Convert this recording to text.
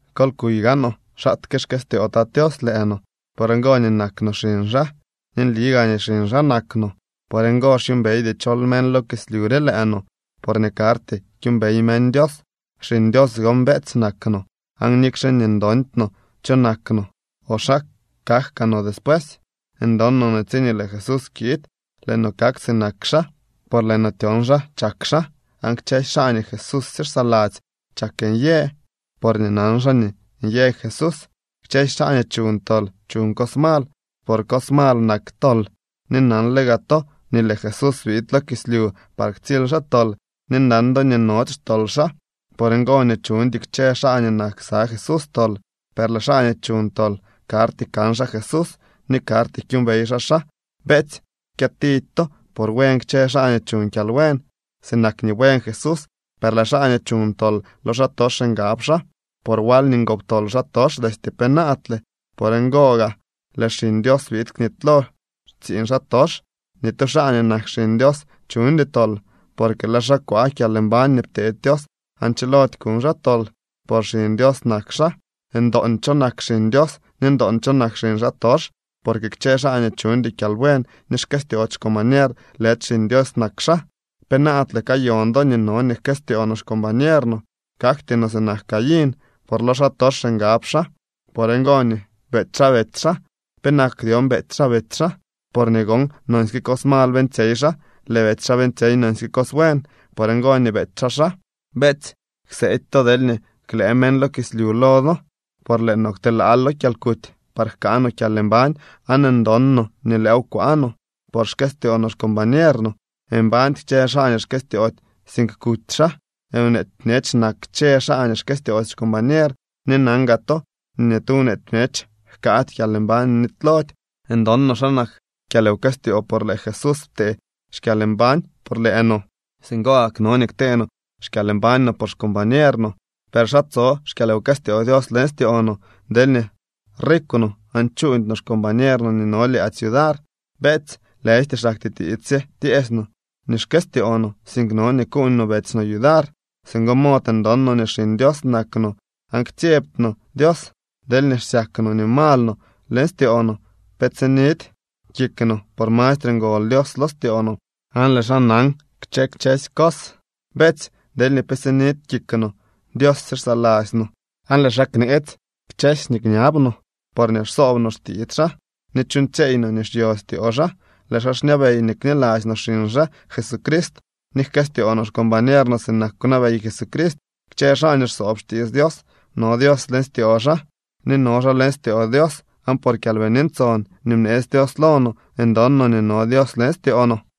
Kol kuy gaanoo xaatke xkëstyoo Tat Tios lëë no. Por ngo nii nak no xiñ xaa, ni nli gaa nii xiñ xaa nak no. Por ngo xyuumbeydy chol meñ lo kislyu re lëë no, porñee karty kyuumbey meñ Dios. Xiñ Dios gon, beetsy, nak no, aan nikxe nii ndondy no cho kak no o xa kak kaa no despuesy, ndon no nii tsiñee lëë Jesús kiid, lëë no kak sinak xaa, por lëë no tyon xa chak xaa. Aan kchësy xaa nii Jesúsye xsaladzy chak nyë, porñee nan xaa nii nyë Jesús. Kchësy xaa nii chuñ tol chuñ cos mal, por cos mal nak tol. Ni nanle gaa to nii lëë Jesús biid lo kislyu par ktsily xaa tol, ni nan do nii nody xtol xaa. Por ngo nii chuñdy kchë xaa nii nak ksa Jesús tol, per lëë xaa nii chuñ tol karty kan xaa Jesús ni karty kyuumbey xaa xaa. Beetsy, kyëtidy to por buen kchë xaa nii chuñ kyalbuen, sinak nii buen Jesús. Per lëë xaa nii chuñ tol lo xaatox ngab xaa, por wal nii ngoptol xaatox destye penaadle. Por ngoo gaa lëë Xiñ Dios biid knitylo xtsiiñ xaatox. Ni tu xaa nii nak xiñ Dios chuñdy tol, porque lëë xaa kwaa kyalmbañ nii pteedy Dios aan chilody kuñ xaa tol, por xiñ Dios nak xaa. Ndoon cho nak xiñ Dios ni ndoon cho nak xiñ xaatox, porque kchë xaa nii chuñdy kyalbuen ni xkëstyoody xcombañer lëdy xiñ Dios nak xaa. Penaadle kayon do nii no nii jkëstyoo no xcombañer no. Kakty no sinak Caín, por lo xaatox ngab xaa. Por ngo nii beety xaa betsy xaa. ¿Penak dyon beety xaa betsy xaa? Porñee gon nonsyke cos mal beeñtsyey xaa. Lëë betsy xaa beeñtsyey nonsyke cos buen. Por ngo nii beety xaa xaa. Beetsy, kseedy to deelñee klëë meñ lo kislyu lo do. Por lëë no kwtelaal lo kyalkuty par jkaa no kyalmbañ aan ndon no nii lëëw kwaa no, por xkëstyoo no xcombañer no. Mbañdy kchë xaa nii xkëstyoody, sink kuty xaa. Nweety bñech nak kchë xaa nii xkëstyoody xcombañer ni nan gaa to nii ni tu nweety bñech jkaady kyalmbañ nii nitylody. Ndon no xa nak kyalwkëstyoo por lëë Jesús ptee xkyalmbañ por lëë no. Singo gak, no nii ktee no xkyalmbañ no por xcombañer no. ¿Per xa tso xkyalwkëstyoo Dios leñ styoo no deelñee rikw no aan chuuñdy no xcombañer no nii no lyaadzy yudar? Beetsy, lëjty xaktyee tiits sye tyeesy no nii xkëstyoo no, sink no nii kuuñ no betsy no yudar. Singo mod ndon no nii xiñ Dios nak no, aan ktsyebty no Dios. Deelñee xsyak no nii mal no leñ styoo no, pe tsinidy kik no, por mastre ngol Dios lo styoo no aan lëë xaa nan kchë kchësy cos. Beetsy, deelñee pe sinidy kik no, Dios sye xsaladzy no. Aan lëë xaa kneetsy kchësy nii kñab no, porñee xsoob no xtiits xaa ni chuuñtsyeey no nii xyo styoo xaa. Lëë xaa xñabey nii kniladzy no xiñ xaa Jesucrist, ni jkëstyoo no xcombañer no sinak kwnabey Jesucrist. Kchë xaa nii xsoob xtiits Dios, no Dios leñ styoo xaa ni no xaa leñ styoo Dios. Aan por Kyalbini Ntson nii bneetsy Dios lo no ndon no nii no Dios leñ styoo no.